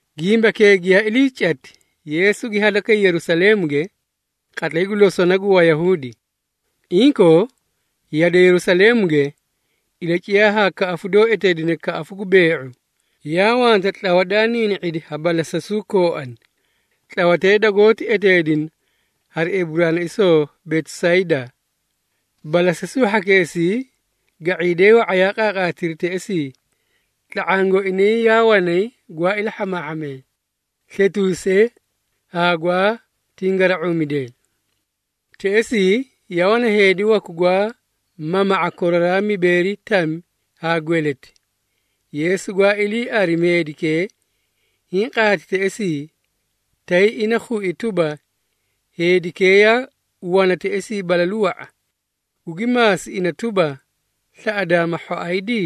Gimbakee giyaa ilii cati, Yeesu gi hadakay Yerusaleemuge, qatlay gu losona gu Wayahuudi. Inkoo, yade Yerusaleemuge, ilaciyaa haa kaꞌafu doó eteedine Kaꞌafu gu Bee⁄u, yaa wanta tlawa daa niini⁄idi ha balasasuu kooani. Tlawatee dagoóti eteedina hari Eburaanaisoo Betisaydaa. Balasasuu hhakeesii ga⁄iidee wa⁄a yaa qaaqaatiri teꞌesii, tla⁄aã gooinay yaa wanay gwaa ilahhamaahhamee, sletuusee haa gwaa tingara⁄uumidee. Teꞌesii yaa wana heedi waku gwaa mama⁄a koraraa mibeeri tami haa gweleti. Yeesu gwaa ilii arimi heedikee hiĩ qaati teꞌesii, tay ina khui tuba, heedikee yaa wana teꞌesii balalu wa⁄a, gugi maasi ina tuba, “Slaꞌadaa ma hhoaydi?”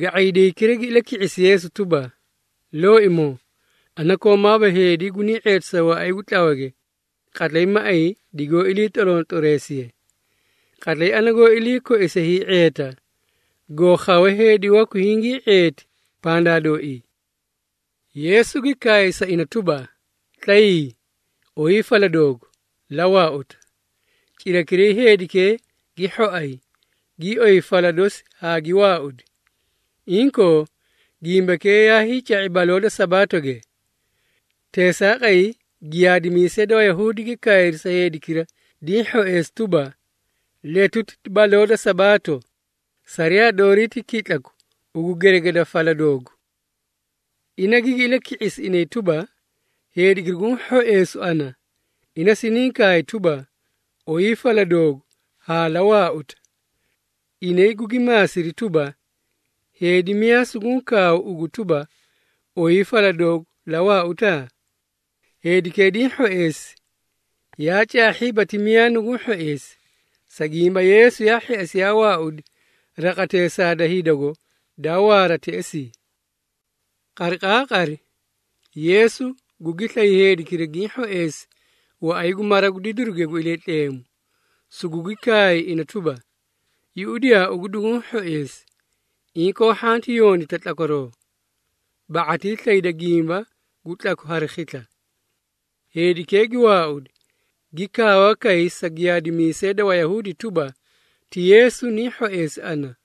Ga⁄iidaykira gi ilaki⁄isi Yeesu tuba, “Looimoo, ana koomaaba heedi gunii ⁄eetisa waꞌay gu tlawage, qatlay maꞌay digoó ilii tlorontloreesiye. Qatlay ana goó ilii koise hii⁄eeta, goo khawe heedi waku hingii ⁄eeti pandaa dooii.” Yeesu gi kaay sa ina tuba, “Tlayii, oyii fala doogu, la waauta.” Cirakiray heedikee gi hhoay, gii oyi fala dosi haa gi waaudi. Inkoo, gimbakee yaay ca⁄i baloo da Sabaatoge. Teesaaqay, giyaadimiisee da Wayahuudi gi kaayri sa heedikira diĩ hhoeesi tuba, “Letuti ti baloo da Sabaato, sariyaa doorii ti kitlaku ugu geregeda fala doogu.” Ina gigi ilaki⁄isi inay tuba, “Heedikira guũ hhoeesu ana, ina siniĩ kaay tuba ‘Oyii fala doogu haa la waauta.’” Inay gugi maasiri tuba, “Heedi miyaa suguũ kaawu ugu tuba, ‘Oyii fala doogu la waauta?’” Heedikee diĩ hhoeesi, yaa caahhiiba ti miyaa nuguũ hhoeesi, sa gimba Yeesu yaa hheꞌesi yaa waaudi raqateesaa da hidago daa waara teꞌesii. Qariqaaqari, Yeesu gugi slay heedikira giĩ hhoeesi waꞌay gu mara gu didiruge gu Iliitleemu, sugugi kaay ina tuba, “Yuꞌudiyaa ugu duguũ hhoeesi. Inkoo, hhanti yondita kara tlakwaroo, ba⁄atii slayda gimba gu tlaku hari khisla.” Heedikee gi waaudi, gi kaawa kay sa giyaadimiisee da Wayahuudi tuba, ti Yeesu niĩ hhoeesi ana.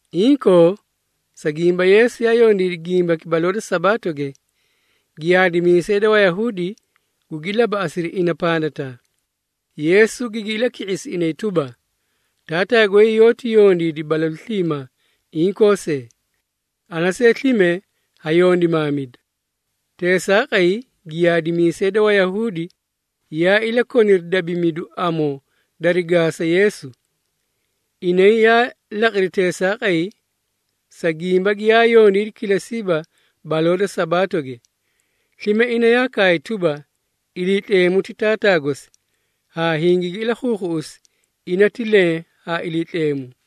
Inkoo, sa gimba Yeesu yaa yondiidi gimbaki baloo da Sabaatoge, giyaadimiisee da Wayahuudi gugi labaꞌasiri ina pandataa. Yeesu gigi ilaki⁄isi inay tuba, “Taataa goy yoóti yondiidi balalu sliimaa inkoo see. Ana see slime ha yondimaamida.” Teesaaqay, giyaadimiisee da Wayahuudi yaa ilakoniri dabimidu amoo dari gaasa Yeesu. Inay yaa laqiri teesaaqay, sa gimba giyaa yondiidi kilesiiba baloo da Sabaatoge. Slime ina yaa kaay tuba, Iliitleemu ti Taataa gosi, haa hingigi ilakhuukhuꞌusi ina ti leẽ haa Iliitleemu.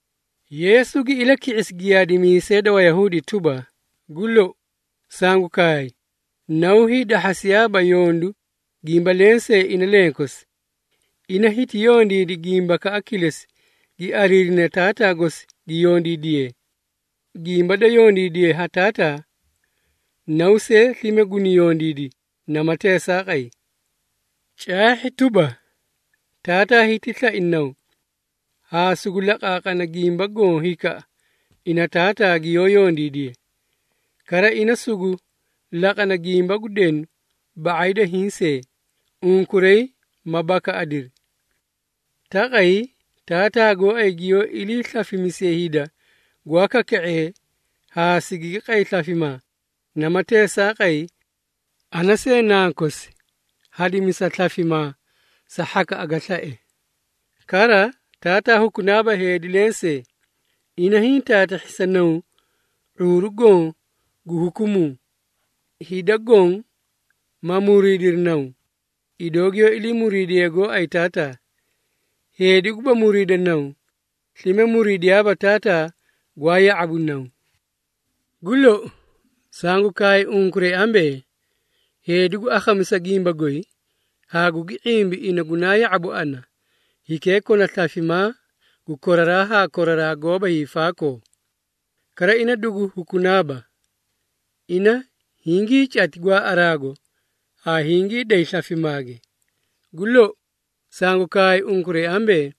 Yeesu gi ilaki⁄isi giyaadimiisee da Wayahuudi tuba, “Gu lou, sangu kaay, Naw hiidahhasiyaaba yondu gimba lensee ina lenkosi. Ina hiti yondiidi gimbakaꞌa kilesi gi ariirine Taataa gosi gi yondiidiye. Gimba da yondiidiye ha Taataa, Naw see slime guni yondiidi namati teesaaqay. Caahhi tuba, Taataa hiti slai Naw, haa sugu laqaaqana gimba goõ hikaꞌa ina Taataa giyoó yondiidiye. Kara ina sugu laqana gimba gu denu ba⁄ay da hiĩ see, unkuray ma bakaꞌadiri. Taqay Taataa gooay giyoó iliislafimisiye hida gwaa kaka⁄ee haa sigigi qay slafimaa, namati teesaaqay, ana see Nankosi hadimisa slafimaa sa hhakaꞌa ga slae. Kara, Taataa hukunaaba heedi lensee, ina hiĩ taatahhi sa Naw ⁄uuru goõ gu hukumuu, hida goõ ma muriidiri Naw, idoo giyoó ilii muriidiyee gooay Taataa. Heedi guba muriida Naw, slime muriidiyaaba Taataa gwaa ya⁄abu Naw. Gu lou, sangu kaay unkuray ambee, heedi gu akhamisa gimba goy, haa gugi ⁄imbi ina gunaa ya⁄abu ana, hikee kona slafimaa gu koraraa haa koraraa goóba hiifaakoo, kara ina dugu hukunaaba. Ina hingiicati gwaaꞌaraago haa hingii day slafimaage. Gu lou, sangu kaay unkuray ambee,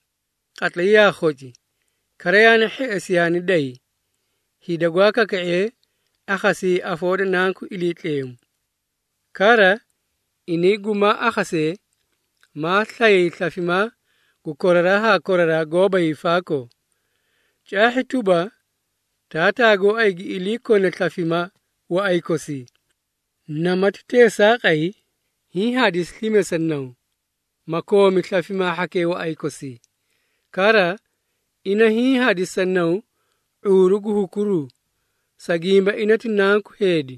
qatlay yaa khoci, kara yaani hheꞌesi yaani day, hida gwaa kaka⁄ee akhasiyayi afoo da Nanku Iliitleemu. Kara, inay gumaa akhasee, maa slayay slafimaa gu koraraa haa koraraa goóba hiifaakoo. Caahhi tuba, Taataa gooay gi ilii kone slafimaa waꞌay kosii, namati teesaaqay hiĩ hadisi slime sa Naw, ma koomi slafimaa hhakee waꞌay kosii. Kara, ina hiĩ hadisi sa Naw ⁄uuru gu hukuruu, sa gimba ina ti Nanku Heedi.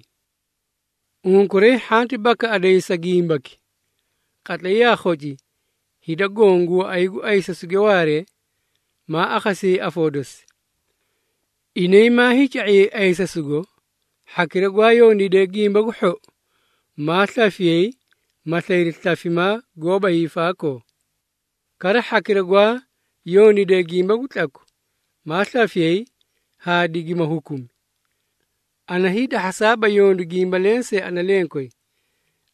Unkuray hhanti bakaꞌadayi sa gimbaki. Qatlay yaa khoci hida goõ gu waꞌay gu ayisasuge waaree, maa akhasiyayi afoo dosi. Inay maa hiica⁄iyay ayisasugo, hhakira gwaa yondiidee gimba gu hhou, maa slafiyay ma slayri slafimaa goóba hiifaakoo. Kara hhakira gwaa yondiidee gimba gu tlaku, maa slafiyay haa digimaa hukuna. Ana hiidahhasaaba yondu gimba lensee ana lenkoyi.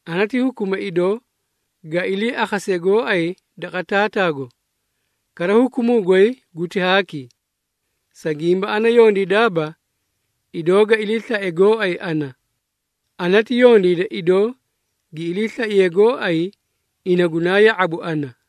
Ana ti hukuma idoo ga iliiakhase gooay daqa Taataago. Kara hukumuu goy guti haaki, sa gimba ana yondiidaaba, idoo ga iliislae gooay ana. Ana ti yondiida idoo gi iliislaiye gooay ina gunaa ya⁄abu ana.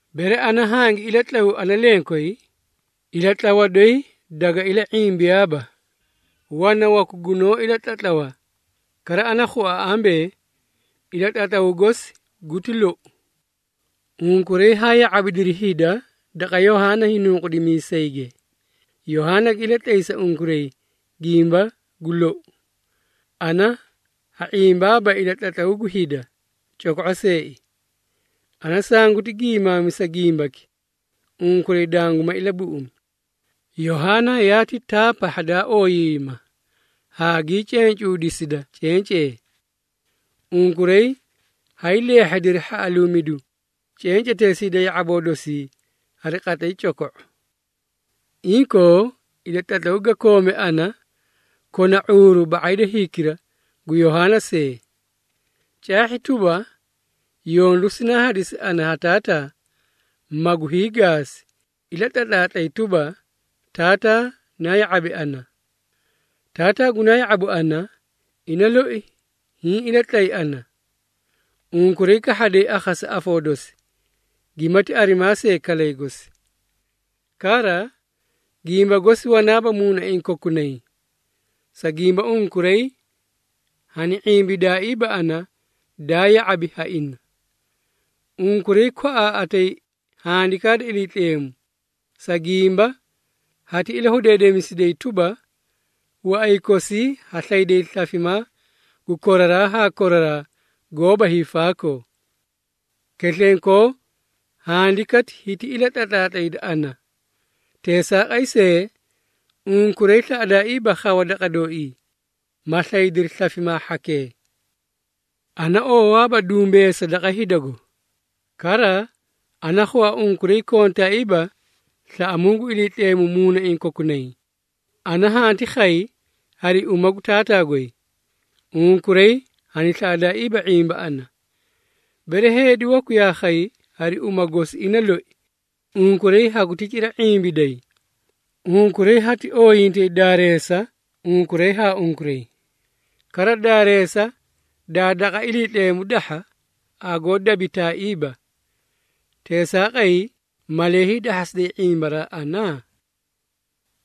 Bere ana hangi ilatlawu ana lenkoyi, ilatlawa doyi daga ila⁄imbiyaaba. Wana waku gunoó ilatlatlawa, kara ana khua ambee, ilatlatlawu gosi guti lou. Unkuray haa ya⁄abidiri hida daqa Yohaana Hiinunqudimiisage, Yohaana gi ilatlay sa unkuray gimba gu lou. Ana ha ⁄imbaaba ilatlatlawu gu hida, coko⁄o seei. Ana sanguti giimaamisa gimbaki, unkuray danguma ilabuꞌumi. Yohaana yaati taa pahha daa ooyiiyima, haa gii cencuudisida cencee. Unkuray haay leehhediri hhaꞌaluumidu cenceteesii da ya⁄aboo dosii hari qatlay coko⁄o. Inkoo, ilatlatlaw ga koome ana kona ⁄uuru ba⁄ay da hikira gu Yohaana see. Caahhi tuba, yondu sinaa hadisi ana ha Taataa, magu hiigaasi, ilatlatlaatlay tuba, Taataa naa ya⁄abi ana. Taataa gunaa ya⁄abu ana, ina loi hiĩ ilatlay ana. Unkuray kahhaday akhasa afoo dosi, gimati arimaa see kalay gosi. Kara, gimba gosi wanaaba muunaiĩ kokunay, sa gimba unkuray hani ⁄imbidaaiiba ana daa ya⁄abi ha ina. Unkuray kwaꞌaaꞌatay Handikaa da Iliitleemu, sa gimba hati ilahudeedemisiday tuba, waꞌay kosii ha slayday slafimaa gu koraraa haa koraraa goóba hiifaakoo. Keslenkoo Handikati hiti ilatlatlaatlayda ana. Teesaaqay see, unkuray slaꞌadaaiiba khawa daqa dooii, ma slaydiri slafimaa hhakee. Ana oowaaba dumbeesa daqa hidago. Kara, ana khua unkuray kontaaiiba slaꞌamuu gu Iliitleemu muunaiĩ kokunay. Ana hanti khay hari uma gu Taataa goy, unkuray hani slaꞌadaaiiba ⁄imba ana. Bere heedi waku yaa khay hari uma gosi ina loi, unkuray haguti cira ⁄imbiday. Unkuray hati ooyintay daareesa unkuray haa unkuray, kara daareesa daa daqa Iliitleemu dahha, hagoó dabitaaiiba. Teesaaqay malee hiidahhasiday ⁄imbaraa ana?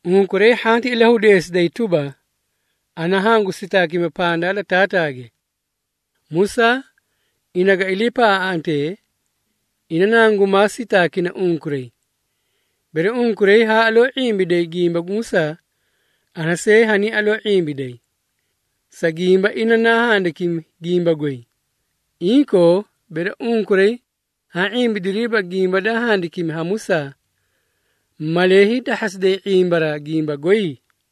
Unkuray hhanti ilahudeesiday tuba, ana hangu sitaakima pandaa da Taataage. Musaa, ina ga iliipaꞌaaꞌantee, ina nangumaa sitaakina unkuray. Bere unkuray haa aloo ⁄imbiday gimba gu Musaa, ana see haniĩ aloo ⁄imbiday, sa gimba ina naa handikimi gimba goy. Inkoo, bere unkuray haã ⁄imbidiriiba gimba daa handikimi ha Musaa, malee hiidahhasiday ⁄imbaraa gimba goy?”